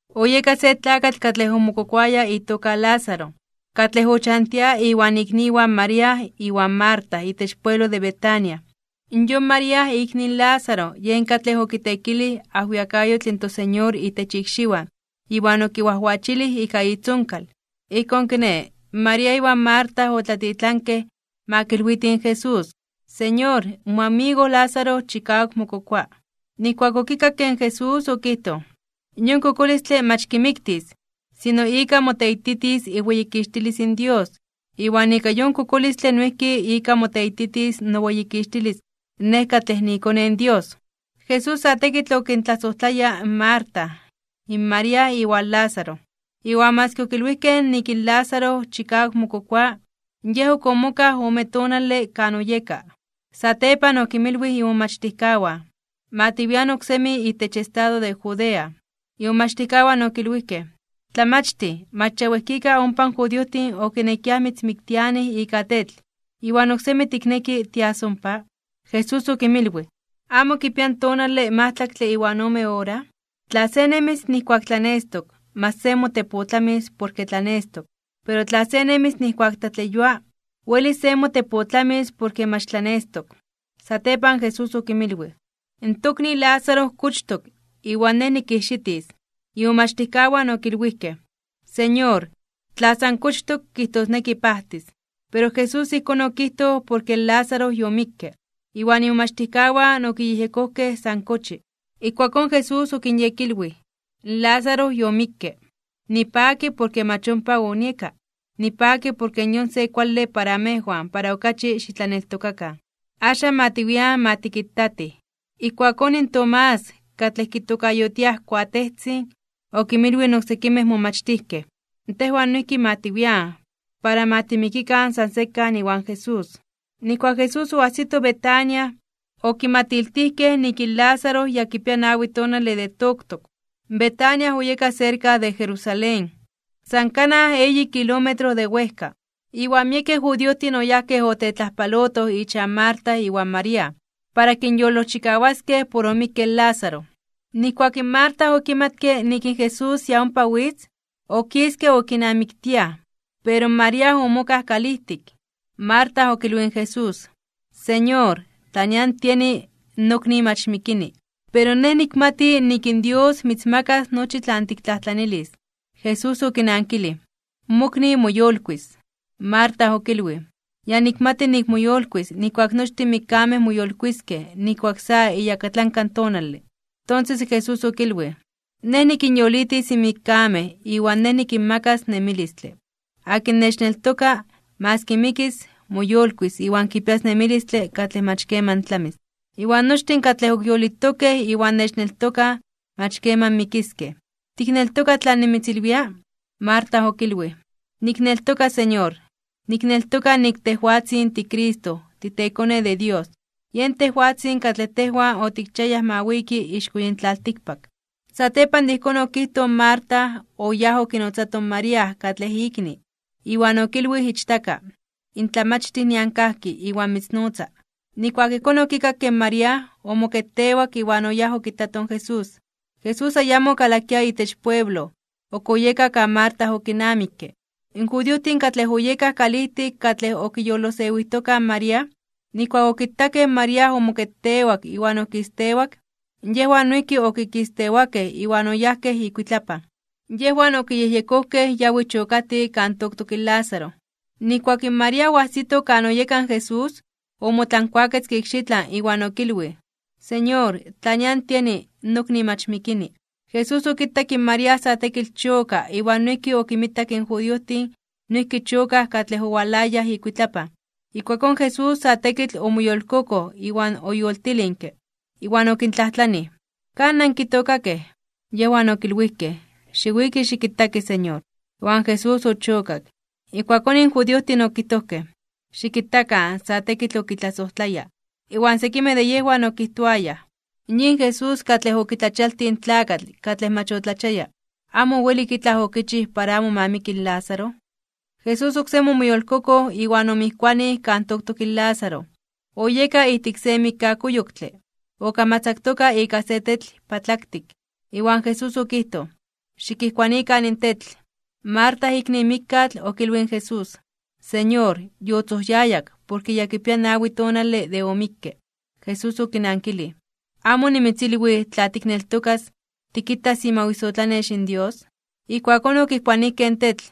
Oyeka se tlakatl katlej omokokoaya itoka Lázaro, katlej ochantia iwan ikniwan María iwan Marta itech pueblo de Betania. Yon María, ikni in Lázaro, yen katlej okiteekilij ajwiakayotl in toSeñor itech ikxiwan iwan okinwajwachilij ika itzonkal. Ijkón kiné, María iwan Marta otlatitlankej ma kilwitij in Jesús: ―Señor, moamigo Lázaro chikawak mokokoa. Nijkuak okikakke in Jesús okijtoj: ―Yon kokolistle mach kimiktis, sino ika moteititis iweyikixtilis in Dios. Iwan ika yon kokolistle noijki ika moteititis noweyikixtilis Nej katlej niiKone in Dios. Jesús sa tekitl okintlasojtlaya in Marta, in María iwan Lázaro, iwan maski okilwijkej nik in Lázaro chikawak mokokoa, Yej ok omokaj ome tonale kan oyeka. Satepan okimilwij imomachtijkawan: ―Ma tiwian oksemi itech estado de Judea. Imomachtijkawan okilwijkej: ―Tlamachtij, mach ya wejkika ompa in judiojtin okinekiaj mitzmiktianij ika tetl, ¿iwan oksemi tikneki tias ompa? Jesús okinmilwij: ―¿Amo kipia in tonale majtlaktle iwan ome ora? Tla se nemis nijkuak tlanestok, mach se motepotlamis porke tlanestok. Pero tla se nemis nijkuak tlatleyua, welis se motepotlamis porke mach tlanestok. Satepan Jesús okinmilwij: ―In tokni Lázaro kochtok, iwan Nej nikijxitis. Imomachtijkawan okilwijkej: ―Señor, tla san kochtok, kijtosneki pajtis. Pero Jesús ijkón okijtoj porke in Lázaro yomikke, iwan imomachtijkawan okiyejyekojkej san kochi. Ijkuakón Jesús okinyekilwij: ―In Lázaro yomikke. Nipaki porke mach ompa onieka. Nipaki porke yon se kuale para amejwan para okachi xitlaneltokakan. Axan ma tiwian ma tikitatij. Ijkuakón in Tomás, katlej kitokayotiaj Kuatejtzin, okinmilwij in oksekimej momachtijkej: ―Tejwan noijki ma tiwian, para ma timikikan san sekan iwan Jesús. Nijkuak in Jesús oajsito Betania, okimatiltijkej nik in Lázaro ya kipia nawi tonale de toktok. Betania oyeka serka de Jerusalén, san kanaj eyi kilómetro de wejka. Iwan miekej judiojtin oyajkej otetlajpalotoj ichan Marta iwan María, para kinyolojchikawaskej por omikke in Lázaro. Nijkuak in Marta okimatke nik in Jesús ya ompa witz, okiske okinamiktiaj, pero in María omokaj kalijtik. Marta okilwij in Jesús: ―Señor, tla nian tieni, nokni mach mikini. Pero nej nikmati nik in Dios mitzmakas nochi tlan tiktlajtlanilis. Jesús okinankilij: ―Mokni moyolkuis (moyolitis). Marta okilwij: ―Ya nikmati nik moyolkuis nijkuak nochtin in mikkamej moyolkuiskej nijkuak sa iyakatlanka tonale. Tonses in Jesús okilwij: ―Nej nikinyolitis in mikkamej iwan Nej nikinmakas nemilistle. Akin nechneltoka, maski mikis, moyolkuis iwan kipias nemilistle katlej mach keman tlamis. Iwan nochtin katlej ok yolitokej iwan nechneltokaj, mach keman mikiskej. ¿Tikneltoka tlan nimitzilwia? Marta okilwij: ―Nikneltoka, Señor. Nikneltoka nik tejwatzin tiCristo, titeKone de Dios. Yen tejwatzin katlej tejwan otikchiayaj ma wiki ixko yin tlaltikpak. Satepan de ijkón okijtoj in Marta, oyáj okinotzato in María katlej ikni, iwan okilwij ichtaka: ―In Tlamachtij nian kajki iwan mitznotza. Nijkuak ijkón okikakke in María, omoketewak iwan oyáj okitato in Jesús. Jesús ayamo okalakia itech pueblo, ok oyeka kan Marta okinamikke. In judiojtin katlej oyekaj kalijtik katlej okiyolosewijtokaj in María, nijkuak okitakej in María omoketewak iwan okistewak, yejwan noijki okikistewakej iwan oyajkej ikuitlapan. Yejwan okiyejyekojkej yawi chokatij kan toktok in Lázaro. Nijkuak in María oajsito kan oyeka in Jesús, omotlankuaketzke ikxitlan, iwan okilwij: ―Señor, tla nian tieni, nokni mach mikini. Jesús okitak in María sa tekitl choka iwan noijki okinmitak in judiojtin noijki chokaj katlej owalayaj ikuitlapan. Ijkuakón Jesús sa tekitl omoyolkokoj iwan oyoltilinke. Iwan okintlajtlanij: ―¿Kan nankitookakej? Yejwan okilwijkej: ―Xiwiki xikitaki, Señor. Iwan Jesús ochokak. Ijkuakón in judiojtin okijtojkej: ―Xikitakan sa tekitl okitlasojtlaya. Iwan sekimej de yejwan okijtoayaj: ―Yin Jesús katlej okitlachialtij in tlakatl katlej mach otlachiaya, ¿amo owelik itlaj okichij para amo ma miki in Lázaro? Jesús oksemi omoyolkokoj iwan omijkuanij kan toktok in Lázaro. Oyeka ijtik se mikkakuyoktle, okamatzaktoka ika se tetl patlaktik. Iwan Jesús okijtoj: ―Xikijkuanikan in tetl. Marta ikni in mikkatl, okilwij in Jesús: ―Señor, yotzojyayak, porke yakipia nawi tonale de omikke. Jesús okinankilij: ―¿Amo onimitzilwij tla tikneltokas, tikitas imawisotlanex in Dios? Ijkuakón okijkuanijkej in tetl.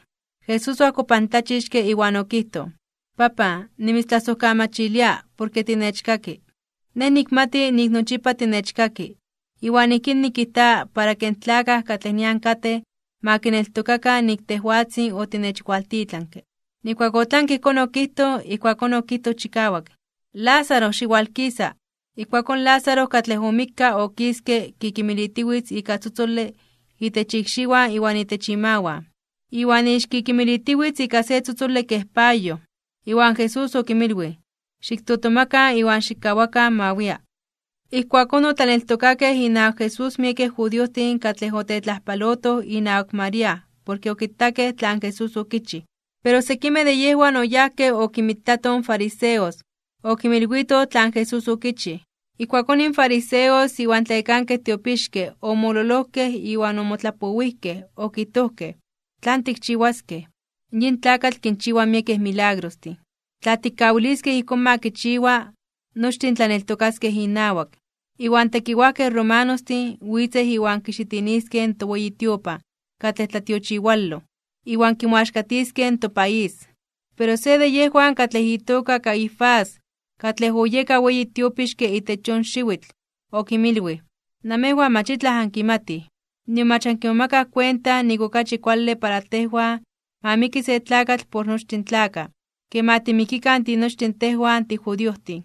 Jesús oajkopantlachixke, iwan okijtoj: ―Papan, nimitztlasojkamachilia porke tinechkaki. Nej nikmati nik nochipa tinechkaki, iwan ijkín nikijta para ke in tlakaj katlej nian katej ma kineltokakan nik tejwatzin otinechwaltitlanke. Nijkuak otlanke ijkón okijtoj, ijkuakón okijtoj chikawak: ―¡Lázaro, xiwalkisa! Iwan Lázaro katlej omikka okiske kikimilitiwitz ika tzotzole itech ikxiwan iwan itech imawan, iwan ixkikimilitiwitz ika se tzotzole kej payoj. Iwan Jesús okinmilwij: ―Xiktotomakan iwan xikkawakan ma wia. Ijkuakón otlaneltokakej inawak Jesús miekej judiojtin katlej otetlajpalotoj inawak María porke okitakej tlan Jesús okichij. Pero sekimej de yejwan oyajkej okinmitatoj in fariseos, okinmilwitoj tlan Jesús okichij. Ijkuakón in fariseos iwan in tlayekankej tiopixkej omololojkej iwan omotlapowijkej, okijtojkej: ―¿Tlan tikchiwaskej? Yin tlakatl kinchiwa miekej milagrostin. Tla tikkawiliskej ijkón ma kichiwa, nochtin tlaneltokaskej inawak, iwan tekiwajkej romanostin witzej iwan kixitiniskej in toweyi tiopan katlej tlatiochiwaloj, iwan kimoaxkatiskej in topaís. Pero se de yejwan katlej itoka Caifás, katlej oyeka weyi tiopixke itech yon xiwitl, okinmilwij: ―Namejwan mach itlaj ankimatij. Nion mach ankimomakaj kuenta nik okachi kuale para tejwan ma miki se tlakatl por nochtin in tlakaj, ke ma timikikan tinochtin tejwan tijudiojtin.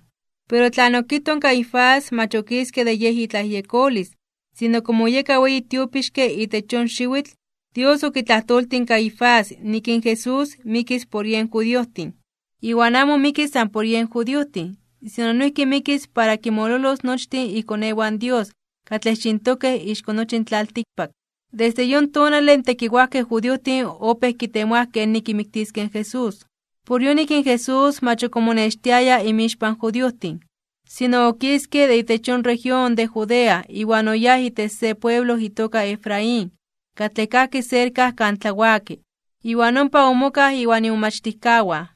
Pero tlan okijtoj in Caifás mach okiske de yej itlayejyekolis, sino komo oyeka weyi tiopixke itech yon xiwitl, Dios okitlajtoltij in Caifás nik in Jesús mikis por yen judiojtin. Iwan amo mikis san por yen judiojtin, sino noijki mikis para kinmololos nochtin ikonewan Dios katlej xintokej ixko nochi in tlaltikpak. Desde yon tonale in tekiwajkej judiojtin opéj kitemoaj kenik kimiktiskej in Jesús. Por yonik in Jesús mach ok omonextiaya inmixpan in judiojtin. Sino okiske de itech yon región de Judea iwan oyáj itech se pueblo itoka Efraín, katlej kajki serka kan tlawaki. Iwan ompa omokaj iwan imomachtijkawan.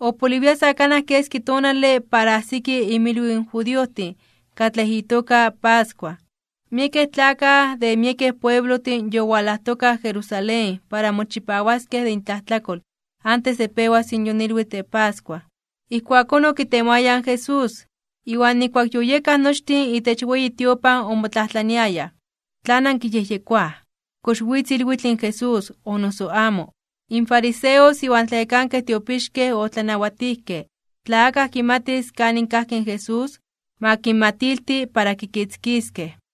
Opoliwia sa kanaj keski tonale para ajsiki imilwiw in judiojtin katlej itoka pascua. Miekej tlakaj de miekej pueblojtin yowalajtokaj Jerusalén para mochipawaskej de intlajtlakol antes de pewas yon ilwitl de pascua. Ijkuakón okitemoayaj in Jesús, iwan nijkuak yoyekaj nochtin itech weyi tiopan omotlajtlaniayaj: ―¿Tlan ankiyejyekoaj? ¿Kox witz ilwitl in Jesús, o noso amo? In fariseos iwan in tlayekankej tiopixkej otlanawatijkej tla akaj kimatis kanin kajki in Jesús, ma kinmatilti, para kikitzkiskej.